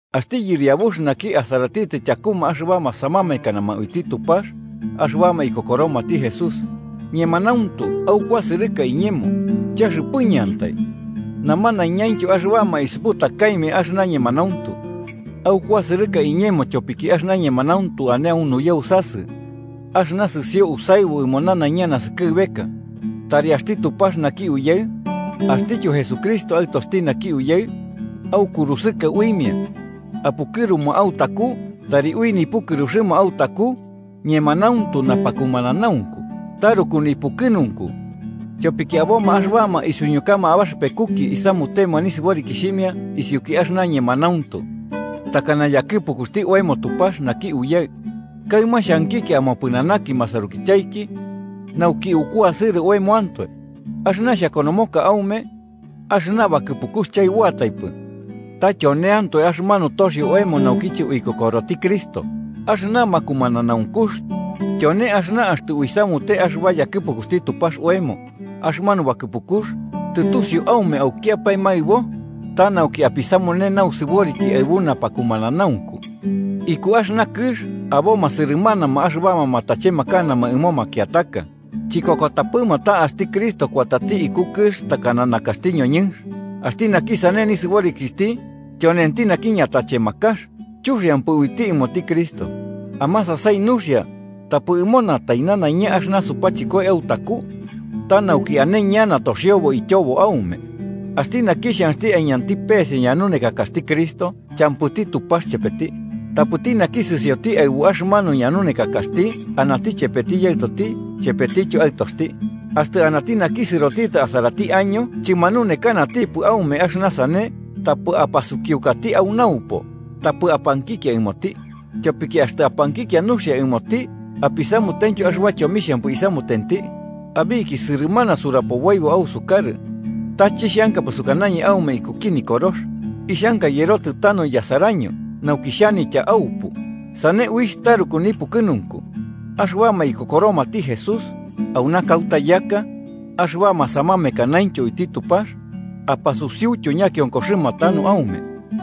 Axti yɨriabux naki asaratitɨ tyakuma axɨbama samamekanama uiti Tupax axɨbama ikokoromati Jesús. Ñemanauntu aukuasɨrɨka iñemo, chaxɨpɨñɨantai, namanaiñaintyo axɨbama isuputakaimia axɨna ñemanauntu. Aukuasɨrɨka iñemo tyopiki axɨna ñemanauntu ane au nuyausasɨ axɨna sɨsio usaɨbu ɨmo nanaiña naskɨbeka. Tari axti Tupax naki Uyaɨ, axtityo Jesucristo, Aɨtoxti naki Uyaɨ, aukurusɨka uimia apukɨruma autaku tari ui nipukɨruxɨma autaku ñemanauntu napakumananaunku. Taruku nipukɨnunku tyopiki aboma axɨbama isuñukama abaxɨpekuki isamutema nisɨborikixhimia isiuki axɨna ñemanauntu, takana yakɨpukuxti oemo Tupax naki Uyaɨ. Kaɨma xhankikia amopɨnanaki masarukityaiki nauki ukuasɨrɨ oemoantoe. Axɨna xhakonomoka aume axɨna bakɨpukux chaɨboataipɨ, ta tyoneantoe axɨmanu toxio oemo naukiche uikokoroti Cristo. Axɨna makumananaunkux tyone axɨna axtɨ uisamute axɨba yakɨpukuxti Tupax oemo, axɨmanu bakɨpukux, tɨtusiu aume aukiapae maɨbo, ta nauki apisamune nausɨboriki aɨbu napakumananaunku. Iku axɨna kɨx aboma sɨrɨmanama axɨbama matachemakanama ɨmo makiataka, chikokotapɨma ta axti Cristo kuatati iku kɨx takana nakaxti ñoñɨnx. Axti naki sane nisɨborikixhti tyonenti naki ñatachemakax chuxiampɨ uiti ɨmoti Cristo. Amasasai nuxia, tapɨ munatai nanaiña axɨna supachɨkoi autaku, ta nauki ane ñana toxiobo ityobo aume. Axti naki xhanxti aiñanti pese ñanunekakaxti Cristo, champɨti Tupax chepeti. Tapɨti naki sɨsioti aɨbu axɨmanu ñanunekakaxti, anati chepeti Yaɨtoti chepetityo Aɨtoxti. Axtɨ anati naki sɨrotitɨ asarati año chɨmanunekanatipɨ aume axɨna sane, tapɨ apasukiukati au naupo tapɨ apankikia ɨmoti. Tyopiki axtɨ apankikia nuxia ɨmoti apisamutentyo axɨba chomixhampɨ isamutenti. Abiki sɨrɨmana surapoboibo ausukarɨ, ta chixhankapɨ sukanañɨ aume ikuki nikorox. Ixhanka yɨrotɨ tanu yasaraño nauki xhanitya aupu. Sane uixh taruku nipukɨnunku. Axɨbama ikokoromati Jesús auna kauta yaka axɨbama samamekanaintyo uiti Tupax, apasusiutyo ñakionkoxɨma tanu aume.